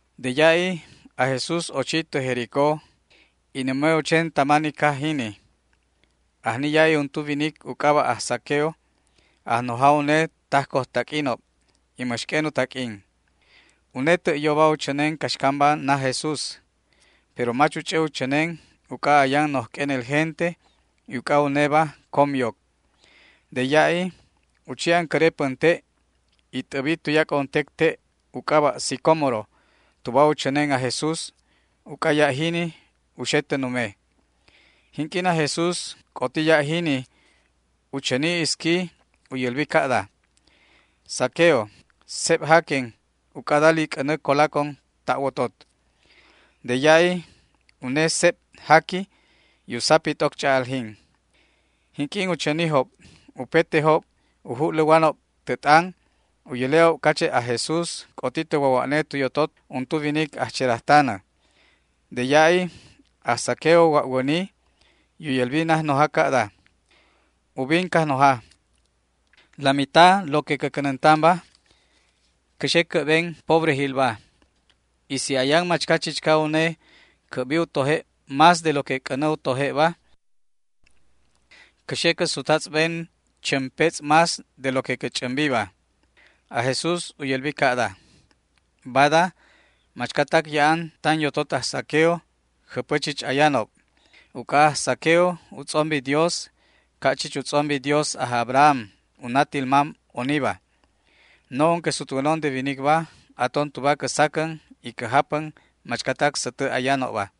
De ya'i aj Jesús ochi tä Jericó y nume u chen tama ni caj jini. Ajni ya'i untu winic u c'aba' aj Zaqueo, ajnoja une tajcojtaq'uinob y mäx q'uen u taq'uin. Une tä' yoba u chänen caxcamba naj Jesús, pero mach u ch'ä u chänen uc'a ayan noj q'uenel gente y uc'a uneba com yoc. De ya'i u chi ancäre pänte' y t'äbi tuyac'o untec te' u c'aba' sicómoro tuba u chänen aj Jesús, uc'a ya' jini u xe tä nume. Jinq'uin aj Jesús c'oti ya' jini u chäni isqui u yälbi ca'da: ―Zaqueo, seb jaquen uc'a dali c'änä colacon ta' wotot. De ya'i une seb jaqui y u sapi t'oc ch'a'aljin. Jinq'uin u chänijob, upetejob u ju'läwanob tä t'an u yäle'ob cache' aj Jesús c'oti tä wawa'ne tu yotot untu winic ajcherajtanäba. De ya'i aj Zaqueo wa'wäni y u yälbi najnoja ca'da: ―Ubin, Cajnoja, la mitad lo que cä cänäntanba cä xe cä'ben pobrejilba y si ayan machca chichca une cä'bi u toje' más de lo que c'änä u toje'ba, cä xe cä sutjatz'ben chämpetz' más de lo que cä ch'ämbiba. Aj Jesús u yälbi ca'da: ―Bada machcatac ya'an tan yotot aj Zaqueo jäpä chich ayanob, uc'a aj Zaqueo u tz'ombi Dios ca' chich u tz'ombi Dios aj Abraham, u natil mam oniba. No'on que sutwänon de winicba aton tuba cä sacän y cä japän machcatac sätä ayanobba.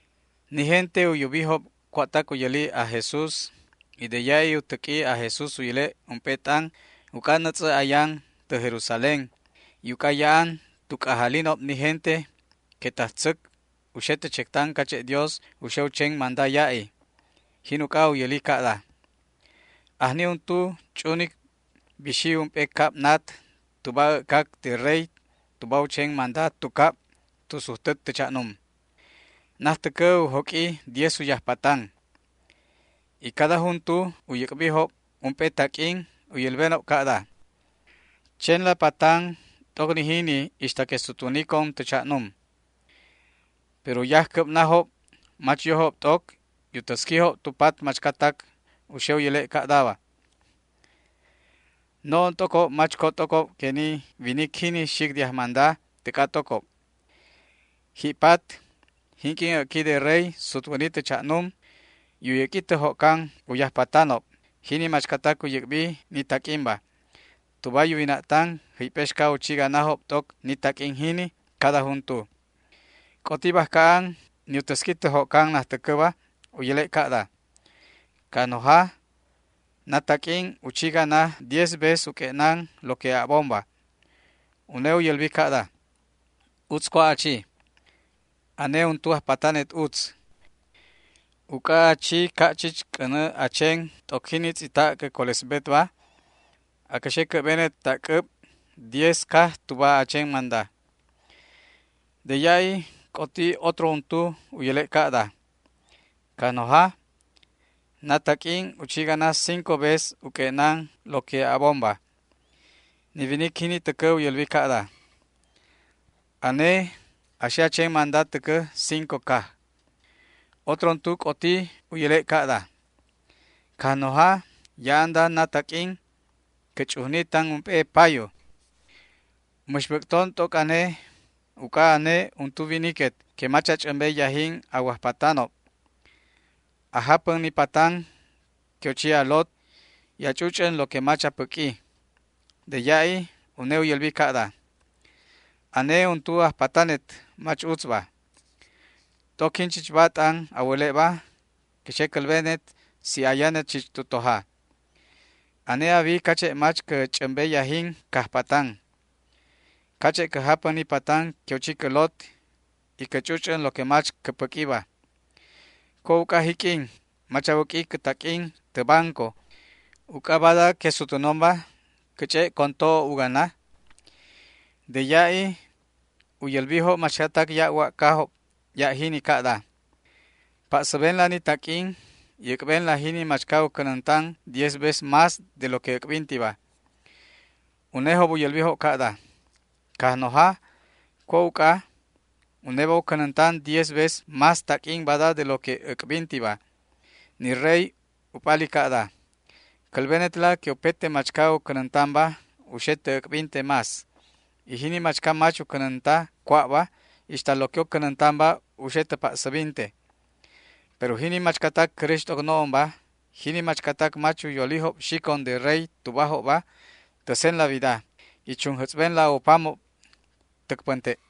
Ni gente u yubijob cua'tac u yäli aj Jesús, y de ya'i u täq'ui aj Jesús u yäle' ump'e t'an, uc'a nätz'ä ayan tä Jerusalén y uc'a ya'an tu c'ajalinob ni gente que tajtzäc u xe tä chectan cache' Dios u xe u chen manda ya'i. Jin uc'a u yäli ca'da: ―Ajni untu ch'unic bixi ump'e cab nat tuba äc'cac de rey tuba u chen manda tu cab tu sujtä tä cha'num. Najtäcä u joq'ui diez u yajpatan, y cada juntu u yäc'bijob ump'e taq'uin u yälbenob ca'da: “Chenla patanla t'oc ni jini ixta que sutwänicon tä cha'num”. Pero u yajcäbnajob mach yojob t'oc y u täsquijob tu pat machcatac u xe u yäle' ca'da: “No'on t'ocob mach co t'ocob que ni winic jini xic de ajmanda täc'a t'ocob”. Ji'pat, jinq'uin äc'qui de rey sutwäni tä cha'num y u yäq'ui tä jo'can u yajpatanob, jini machcatac u yäc'bi ni taq'uinba, tuba yuwina'tan jäyp'exca u chi ganajob t'oc ni taq'uin jini cada juntu. C'oti bajca an ni u täsqui tä jo'can najtäcäba u yäle' ca'da: “Cajnoja, na taq'uin u chi gana diez veces u q'ue'nan lo que a'bonba”. Une u yälbi ca'da: “Utz cua' a chi. Ane untu ajpatanet utz. Uc'a a chi ca' chich c'änä a chen t'oc jini tz'ita' cä colesbetba, acä xe cä'benet ta' c'äb diez caj tuba a chen manda”. De ya'i c'oti otro untu u yäle' ca'da: “Cajnoja, na taq'uin u chi gana cinco veces u q'ue'nan lo que a'bonba”. Ni winic jini täcä u yälbi ca'da: “Ane a xe a chen manda täcä cinco caj”. Otro untu c'oti u yäle' ca'da: “Cajnoja, ya'anda na taq'uin cä ch'ujni tan ump'e payu. Mäx bäc'ton t'oc ane uc'a ane untu winiquet que mach a ch'ämbe yajin a wajpatanob. A japän ni patan que u chi a lot, y a ch'uch'än lo que mach a päq'ui”. De ya'i une u yälbi ca'da: “Ane untu ajpatanet mach utzba. T'oc jinchichba t'an a wäle'ba cä xe cälbenet si ayanet chich tu toja. Ane a wi cache' mach cä ch'ämbe yajin cajpatan, cache' cä japän ni patan que u chi cä lot y cä ch'uch'än lo que mach cä päq'uiba. ¿Cua' uc'a jiq'uin mach a wäq'ui cä taq'uin tä banco, uc'a bada que asutwänonba cä ch'e' con to'o u gana?” De ya'i u yälbijob machcatac ya' wa'cajob ya' jini ca'da: “Pa'säbenla ni taq'uin y äc'benla jini machca u cänäntan diez veces más de lo que äc'bintiba”. Unejob u yälbijob ca'da: “Cajnoja, ¿cua' uc'a? Uneba u cänäntan diez veces más taq'uin bada de lo que äc'bintiba”. Ni rey u p'ali ca'da: “Cälbenetla que upete machca u cänäntanba u xe tä äc'binte más, y jini machca mach u cänänta cua'ba, ixta lo que u cänäntanba u xe tä pa'säbinte. Pero jini machcatac cäräx t'oc no'onba, jini machcatac mach u yolijob xicon de rey tubajobba, täsenla wida y chunjätz'benla u pamob täc pänte'”.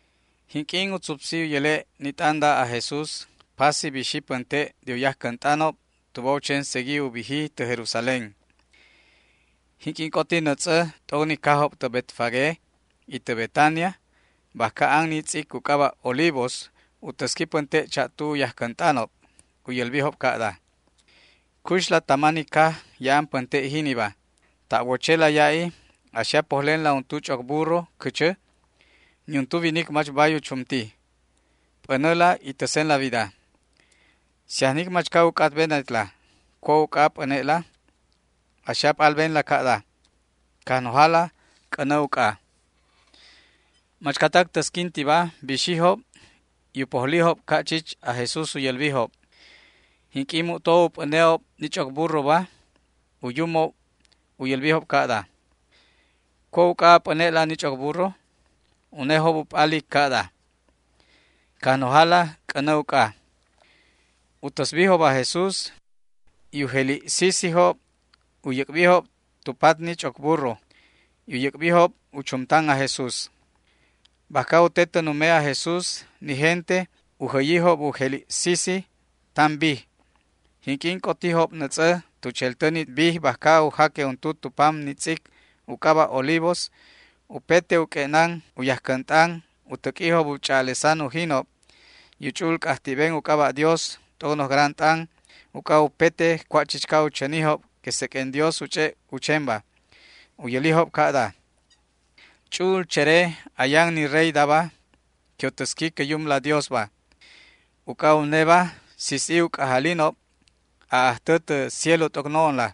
Jinq'uin u tzupsi u yäle' ni t'anda aj Jesús pasi bixi pänte' de u yajcänt'anob tuba u chen segui u biji tä Jerusalén. Jinq'uin c'oti nätz'ä t'oc ni cajob tä Betfagé y tä Betania bajca an ni tz'ic u c'aba' Olivos, u täsqui pänte' cha'tu u yajcänt'anob. U yälbijob ca'da: ―Cuxla tama ni caj ya'an pänte' jiniba. Ta' wochela ya'i a xe a pojlenla untu ch'oc burro cächä. Niuntu winic mach bay u chumti. P'änäla y täsenla wida. Si ajnic machca u c'atbenetla cua' uc'a a p'äne'la, a xe a p'albenla ca'da: “Cajnojala c'änä uc'a”. Machcatac täsquintiba bixijob y u pojlijob ca' chich aj Jesús u yälbijob. Jinq'uin mu'to u p'äne'ob ni ch'oc burroba, u yumob u yälbijob ca'da: ―¿Cua' uc'a a p'äne'la ni ch'oc burro? Unejob u p'alijob ca'da: ―Cajnojala c'änä uc'a. U täsbijob aj Jesús, y u jeli' sisijob u yäc'bijob tu pat ni ch'oc burro, y u yäc'bijob u chumtan aj Jesús. Bajca u te tä nume aj Jesús ni gente u jäyijob u jeli' sisijob tan bij. Jinq'uin c'otijob nätz'ä tu cheltä ni bij bajca u jaque untu tu pam ni tz'ic u c'aba' Olivos, upete u q'ue'nan u yajcänt'an u täq'uijob u ch'a'alesan ujinob y u ch'u'ul c'ajti'ben u c'aba' Dios t'oc noj gran t'an uc'a upete cua' chichca u chänijob que seq'uen Dios u ch'e' u chenba. U yälijob ca'da: ―¡Ch'u'ul chere ayan ni reydaba que u täsqui cä Yumla Diosba! Uc'a uneba, sis'i u c'ajalinob aj Ajtä tä cielo t'oc no'onla.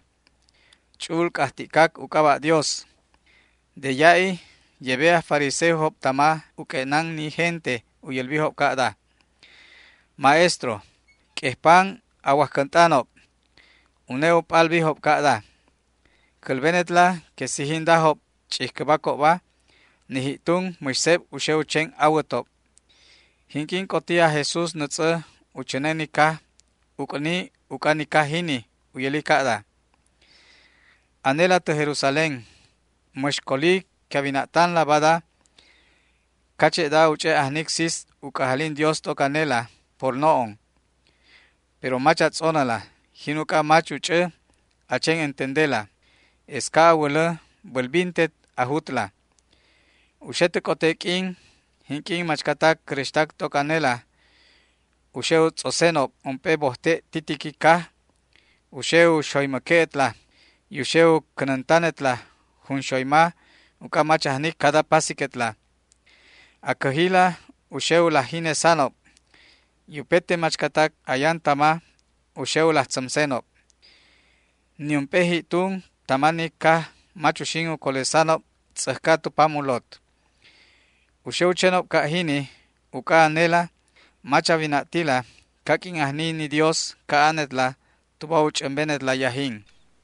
Ch'u'ul c'ajti'cac u c'aba' Dios. De ya'i yebe aj fariseojob tama u q'ue'nan ni gente u yälbijob ca'da: ―Maestro, q'uejpan a wajcänt'anob. Une u p'albijob ca'da: ―Cälbenetla que si jindajob ch'ijcäbacobba, ni ji'tun mäx seb u xe u chen awätob. Jinq'uin c'oti aj Jesús nätz'ä u chänen ni caj, uc'ni uc'a ni caj jini. U yäli ca'da: ―¡Anela tä Jerusalén, mäx coli que a wina'tanla bada cache'da u ch'e' ajnic sis u c'ajalin Dios t'oc anela por no'on! Pero mach a tz'onäla; jin uc'a mach u ch'ä a chen entendela. Es ca' a wälä bälbintet a jutla. U xe tä c'ote q'uinob jinq'uin machcatac cäräxtac t'oc anela u xe u tz'osenob ump'e bojte' titiqui caj, u xe u xoymäque'etla y u xe u cänäntanetla junxoyma uc'a mach ajnic cada pasiquetla. A cäjila u xe u laj jinesanob y upete machcatac ayan tama u xe u laj tzämsenob. Niump'e ji'tun tama ni caj mach uxin u colesanob tz'äjca tu pam u lot. U xe u chenob ca' jini uc'a anela mach a wina'tila caq'uin ajni ni Dios ca'anetla tuba u ch'ämbenet yajinla.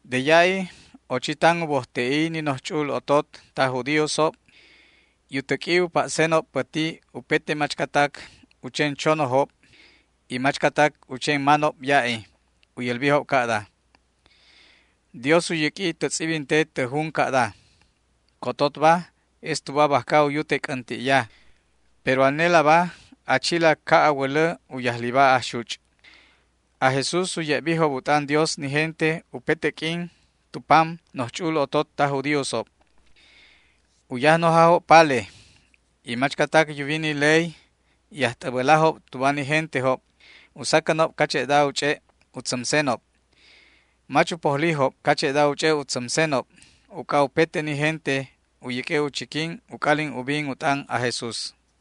De ya'i ochi tan u bojte'i ni noj ch'u'ul otot taj judíosob y u täq'ui u pa'senob päti upete machcatac u chen chonojob y machcatac u chen manob ya'i. U yälbijob ca'da: ―Dios u yäq'ui tä tz'ibinte tä jun ca'da: “Cototba es tuba bajca u yute c'änti'ya”; pero anelaba a chila ca' a wälä u yajliba ajxuch'. Aj Jesús u ye'bijob u t'an Dios ni gente upete q'uin tu pam noj ch'u'ul otot taj judíosob. U yajnojajob pale y machcatac yuwi ni ley y ajt'äbälajob tuba ni gentejob u sacänob cache'da u ch'e' u tzämsenob. Mach u pojlijob cache'da u ch'e' u tzämsenob, uc'a upete ni gente u yäq'ue' u chiquin u c'alin ubinob u t'an aj Jesús.